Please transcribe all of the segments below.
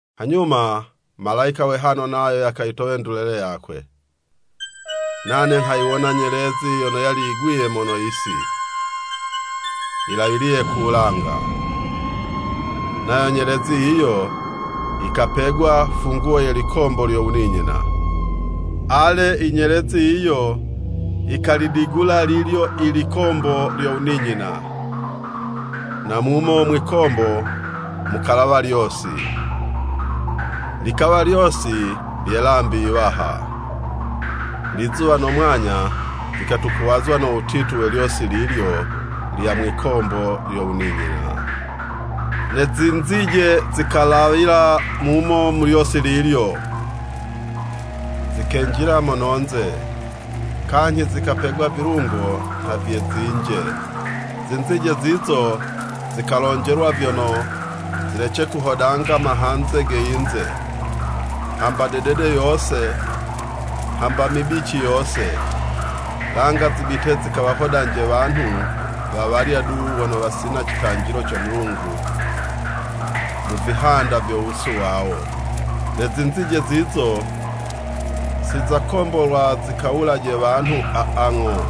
Hanyuma malayika we hano nayo yakayitowa ndulele yakwe. Nane nghayiwona nyelezi yono yali yigwiye mono yisi, yilawiliye ku wulanga. Nayo nyelezi yiyo yikapegwa funguwo ye likombo lyo wuninyina. Ale, inyelezi yiyo yikalidigula lilyo i likombo lyo wuninyina, na mumo mwikombo mukalawa lyosi, likawa lyosi lye 'lambi yiwaha. Lizuwa no mwanya vikatukuwazwa no wutitu we lyosi lilyo lya mwikombo lyo wuninyina. Ne zinzije zikalawila mumo mu lyosi lilyo, zikenjila mono'nze, kanyhi zikapegwa vilungo nha vye zinje. Zinzije zizo zikalonjelwa vyono, zilece kuhodanga mahanze ge yinze, hamba dedede yose, hambe mibici yose, langa zibite zikawahodanje wanhu wawalya du wono wasina citanjilo co Mulungu mu vihanda vyo wusu wawo. Ne zinzije zizo, si zakombolwa zikawulaje wanhu aa, ng'o,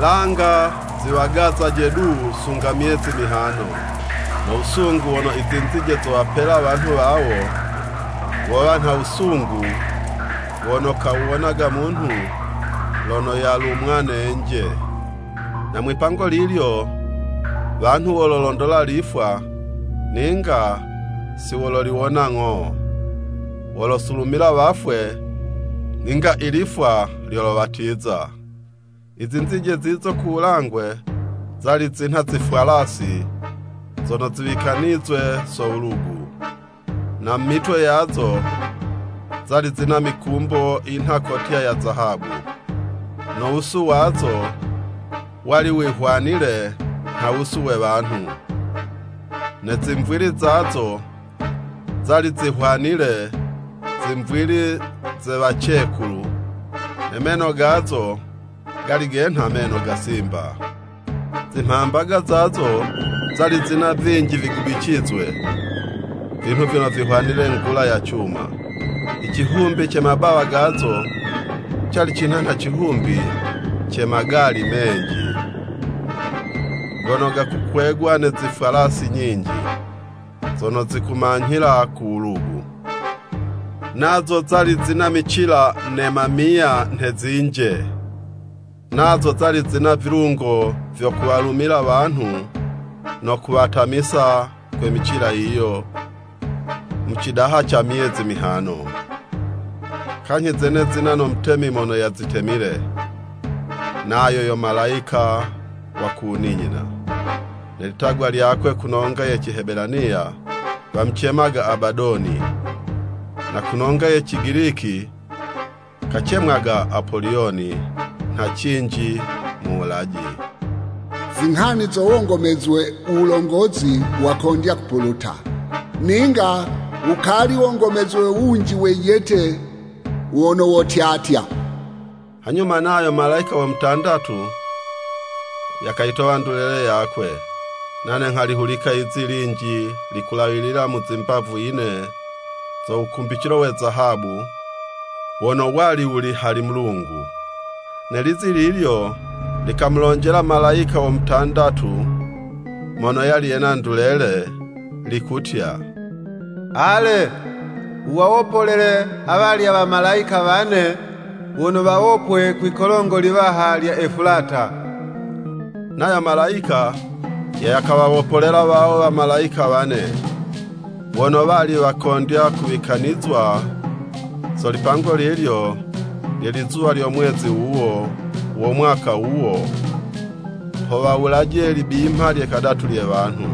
langa ziwagazaje du sunga myezi mihano. No wusungu wono i zinzije zowapela wanhu wawo, wowa nha wusungu wono kawuwonaga munhu lono yalumwa ne 'nje. Na mwipango lilyo, wanhu walolondola lifwa, ninga si wololiwona ng'o, wolosulumila wafwe, ninga ilifwa lyolowatiza I zinzije zizo ku wulangwe, zali zinha zifwalasi zono ziwikanizwe so wulugu. Na mu mitwe yazo, zali zina mikumbo yinha kotya ya zahabu, no wusu wazo, wali wihwanile nha wusu we wanhu. Ne zimvwili zazo, zali zihwanile zimvwili ze wacekulu, ne meno gazo, gali genha meno ga Simba. Zimhambaga zazo, zali zina vinji vigubicizwe, vinhu vyono vihwanile ngula ya cuma. I cihumbi ce mabawa gazo, cali cinha nha cihumbi ca magali menji, gono gakukwegwa ne zifwalasi nyinji, zono zikumanyhila ku wulugu. Nazo zali zina micila ne mamiya nhe zinje, nazo zali zina vilungo vyo kuwalumila wanhu no kuwatamisa kwe micila yiyo, mu cidaha ca myezi mihano. Kanyhi zene zina no mutemi mono yazitemile, nayo yo malayika wa ku wuninyina, ne litagwa lyakwe ku nonga ye Cihebelaniya, wamucemaga, Abadoni, na kunonga ye Cigiliki kacemwaga, Apoliyoni, nha cinji “Muwulaji.” Zinghani zo wongomezwe, wulongozi wakondya kupuluta, ninga wukali wongomezwe wunji wejete wono wotyatya. Hanyuma nayo malayika wo mutandatu, yakayitowa ndulele yakwe. Nane nghalihulika yizi linji likulawilila mu zimbavu yine zo wukumbicilo we zahabu, wono wali wuli hali Mulungu. Ne lizi lilyo likamulonjela malayika wo mutandatu mono yali yena ndulele, likutya, “Ale! Wuwawopolele awalya wamalayika wane wono wawopwe kwi'kolongo liwaha lya Efulata!” Nayo malayika yakawawopolela wawo wamalayika wane, wono wali wakondya kuwikanizwa so lipango lilyo, lye lizuwa lyo mwezi wuwo, wo mwaka wuwo, ho wawulaje libimha lye kadatu lye wanhu.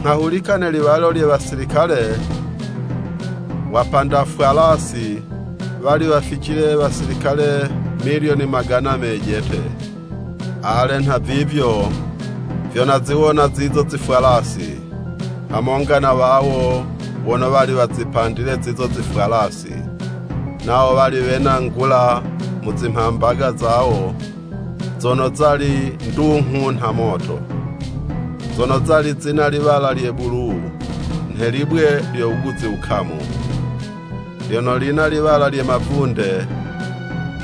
Nghahulika ne liwalo lye wasilikale wapanda fwalasi, wali waficile wasilikale milyoni magana mejete. Ale, nhavivyo vyo naziwona zizo zifwalasi, hamonga na wawo wono wali wazipandile zizo zifwalasi. Nawo wali wena ngula mu zimhambaga zawo zono zali ndunghu nha moto, zono zali zina liwala lye bulu nhe libwe lyo wuguzi wukamu, lyono lina liwala lye mavunde,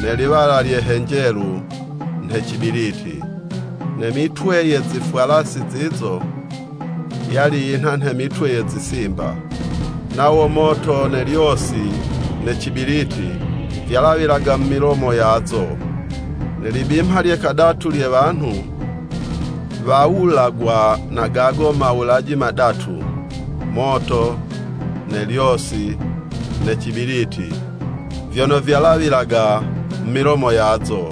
ne liwala lye henjelu, nhe cibiliti. Ne mitwe ye zifwalasi zizo, yali yinha nha mitwe ye zisimba, nawo moto ne lyosi, ne cibiliti, vyalawilaga mu milomo yazo. Ne libimha lye kadatu lye wanhu, wawulagwa na gago mawulaji madatu, moto, ne lyosi, ne cibiliti, vyono vyalawilaga mu milomo yazo,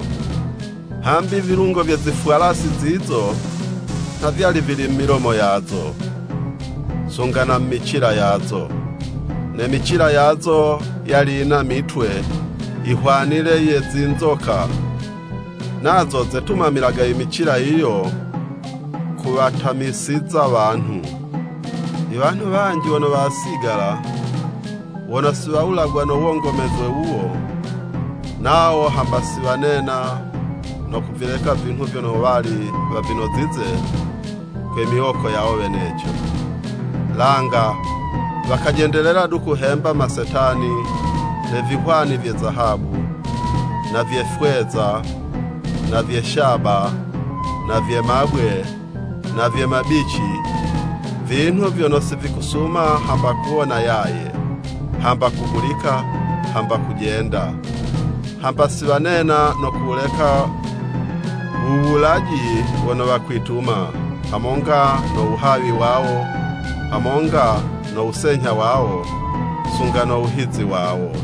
hambi vilungo vye zifwalasi zizo, nha vyali vili mu milomo yazo, sunga na mu micila yazo. Ne micila yazo yali yina mitwe, yihwanile ye zinzoka, nazo zetumamilaga i micila yiyo kuwatamisiza wanhu. I wanhu wanji wono wasigala, wono si wawulagwa no wongomezwe wuwo, nawo hamba si wanena, no kuvileka vinhu vyono wali wavinozize kwe miwoko yawo weneco, langa wakajendelela du kuhemba masetani, ne vihwani vye zahabu, na vye fweza, na vye shaba, na vye mabwe, na vye mabici, vinhu vyono sivikusuma hamba kuwona yaye, hamba kuhulika, hamba kujenda. Hamba si wanena no kuwuleka wuwulaji wono wakwituma, hamonga no wuhawi wawo, hamonga no wusenyha wawo, sunga no wuhizi wawo.